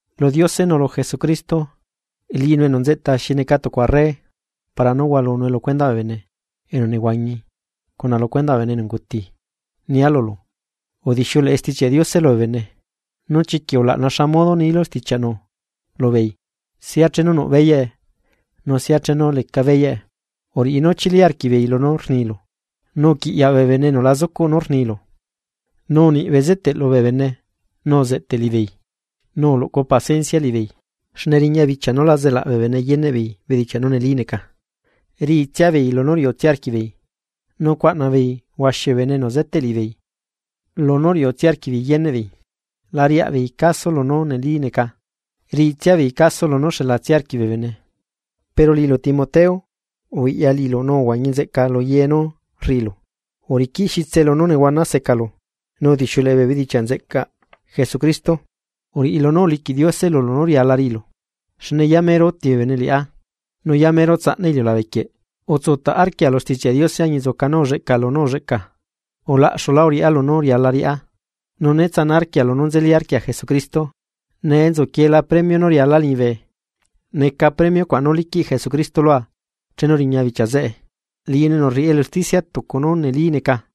Lu Diose nu lu Jesucristo, liꞌinu enu nzeꞌta xi neca tucu arre para nú hualunue lu cuendaꞌ bee bene enu nehuañi cuna lu cuendaꞌ bee bene enu unguti, nia lulu udixiuleꞌe Stichiaꞌ Diose lubee bene, nu chiquiꞌ ulaꞌna xa modo nilu stichiaꞌnu lubeei sia chenu nuꞌ beyaꞌe nu sia chenu leca beyaꞌe, uriꞌi nú chili arquiꞌbeei lunú rnilu, nu uquiꞌyaꞌ bee bene enu la zucuꞌ nú rnilu, nu uniꞌ bezeteꞌ lubee bene nu uzeꞌteꞌ liꞌibeei, nu uluꞌcu paciencia liꞌibeei. Xne riña bichia nú la zelaꞌ bee bene yeneꞌ beei bedichia nú neli neca, riꞌitsia beei lunú riuꞌtsia arquiꞌbeei, nu cuaꞌna beei huaxi bee bene enu zeteꞌ liꞌibeei lunú riuꞌtsia arquiꞌbeei yeneꞌ beei. La riaꞌbeei caso lunú neli neca, riꞌitsia beei caso lunú xelatsia arquiꞌ bee bene. Pero liꞌilu Timoteo ubiꞌya liꞌilu nu uhuañi nzeꞌca lu ye nú rriꞌilu, uriquiꞌ xitse lunú nehuana secalu, nu udixiuleꞌe bee bedichiaꞌ nzeꞌcaꞌ Jesucristo, uriꞌi lunú uliquiꞌ Diose lulu nú riala riꞌilu. Xne yamero uti bee bene liꞌá, nu yamero tsaꞌna iliulabe quieꞌ. Utsutaꞌ arquia lu Stichiaꞌ Diose añinzuca nú ulleꞌca lunú ulleꞌca, ulaꞌxulá uriꞌá lunú riala riꞌá, nu né tsana arquia lunú nzeli arquia Jesucristo. Nee nzuquiela premio nú rialaa liñibe, neca premio cuaꞌ nú liquiꞌ Jesucristo lua chenu riña bichia zeꞌe, liꞌinu enu rriꞌi elu usticia tucu nú neli neca.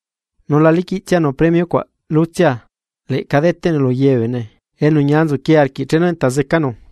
Nu la liquiꞌtsianu premio cuaꞌ lutsia, leꞌca deteꞌnue lu ye bee bene enu ñia nzuquie arquiꞌ chenu enta zecanu.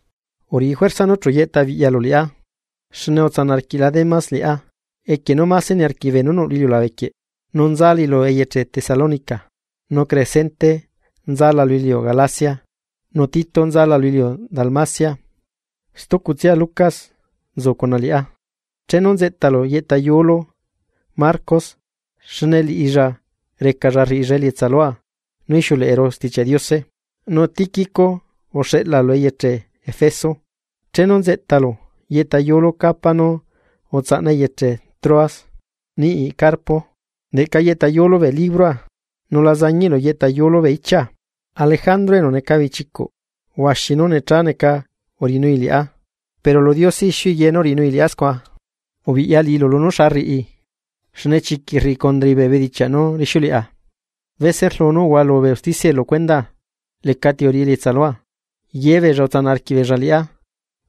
Uriꞌi juerza nú chu yeꞌta biꞌyalu liꞌá, xne utsanaꞌ arquiꞌla Demas liꞌá equie nú máse niarquiꞌi beenú nuꞌ lu iliulabe quieꞌ, nu nzalai lu eyeche Tesalónica. Nu Crescente nzala lu iliu Galacia, nu Tito nza lu iliu Dalmacia. Stucutsia Lucas nzu cuna liꞌá. Chenu nzeꞌtalu yeꞌta yuulu Marcos xne liꞌilla recalla riꞌilla elietsa lua nú ixiuleꞌeru Stichiaꞌ Diose. Nu Tíquico uxeꞌla lu eyeche Efeso. Chenu nzeꞌtalu yeꞌta yuulu capa nu utsaꞌna eyeche Troas niꞌi Carpo, leꞌca yeꞌtayulu bee libroa, nu la zañiꞌlu yeꞌta yuulu bee ichia. Alejandro enu neca bichicuꞌ huaxi nú necha neca uriꞌinui liꞌá, pero lu Diose ixiui ye nú uriꞌinui liꞌá scua. Ubiꞌya liꞌilu lunú xa rriꞌi, xne chiquiꞌ rriꞌi condrai bee bedichiaꞌ nú rixiuleꞌa. Bese rlu nú uhualu bee usticiae lu cuendaa, lecati uriꞌi elietsa lua, yebeella utsanaꞌ arquiꞌbeella liꞌá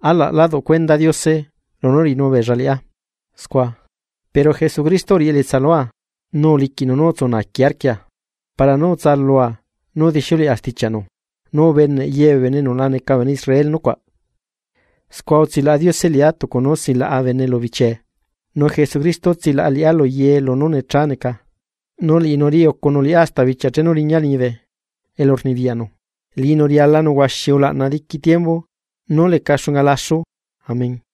alaꞌ lá duꞌ cuenda Diose lunú uriꞌinu beella liꞌá scua. Pero Jesucristo uriꞌi elietsa lua, nu uliquiꞌnu nú utsu naaqui arquia para nú utsalua nú udixiuleꞌa stichiaꞌnu, nu ubeneꞌ ye bee bene enu la neca bee bene Israel nucuaꞌ, scua utsilaꞌa Diose liꞌá tucu nú silaꞌa bene lu bichee. Nu Jesucristo tsilaꞌa liꞌá lu ye lunú necha neca, nu liꞌinu riꞌi ucunu liꞌá hasta bichia chenu riñaa liñibe elu rnibiyaꞌnu. ¡Liꞌinu rialanu huaxi ulaꞌna diqui tiembu nú leca xunga laxu! Amén.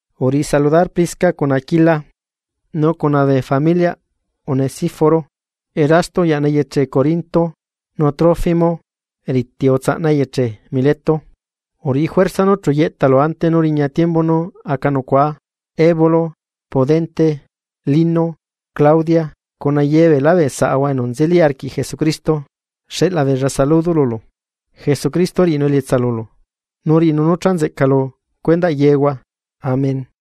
Uriꞌi saludar Prisca cuna Aquila, nu cuna bee familiaꞌ Onesíforo. Erasto uyaꞌna eyeche Corinto, nu Trófimo riti utsaꞌna eyeche Mileto. Uriꞌi juerza nú chu yeꞌtalu ante nú riña tiembu nú aca nucuaa. Eubulo, Pudente, Lino, Claudia, cuna ye beelá bee saꞌahua enu nzeli arquiꞌ Jesucristo, xeꞌla beella saludo lulu. Jesucristo riꞌinu elietsa lulu, nu riꞌinu nú cha nzeꞌca lu cuendaꞌ yehua. Amén.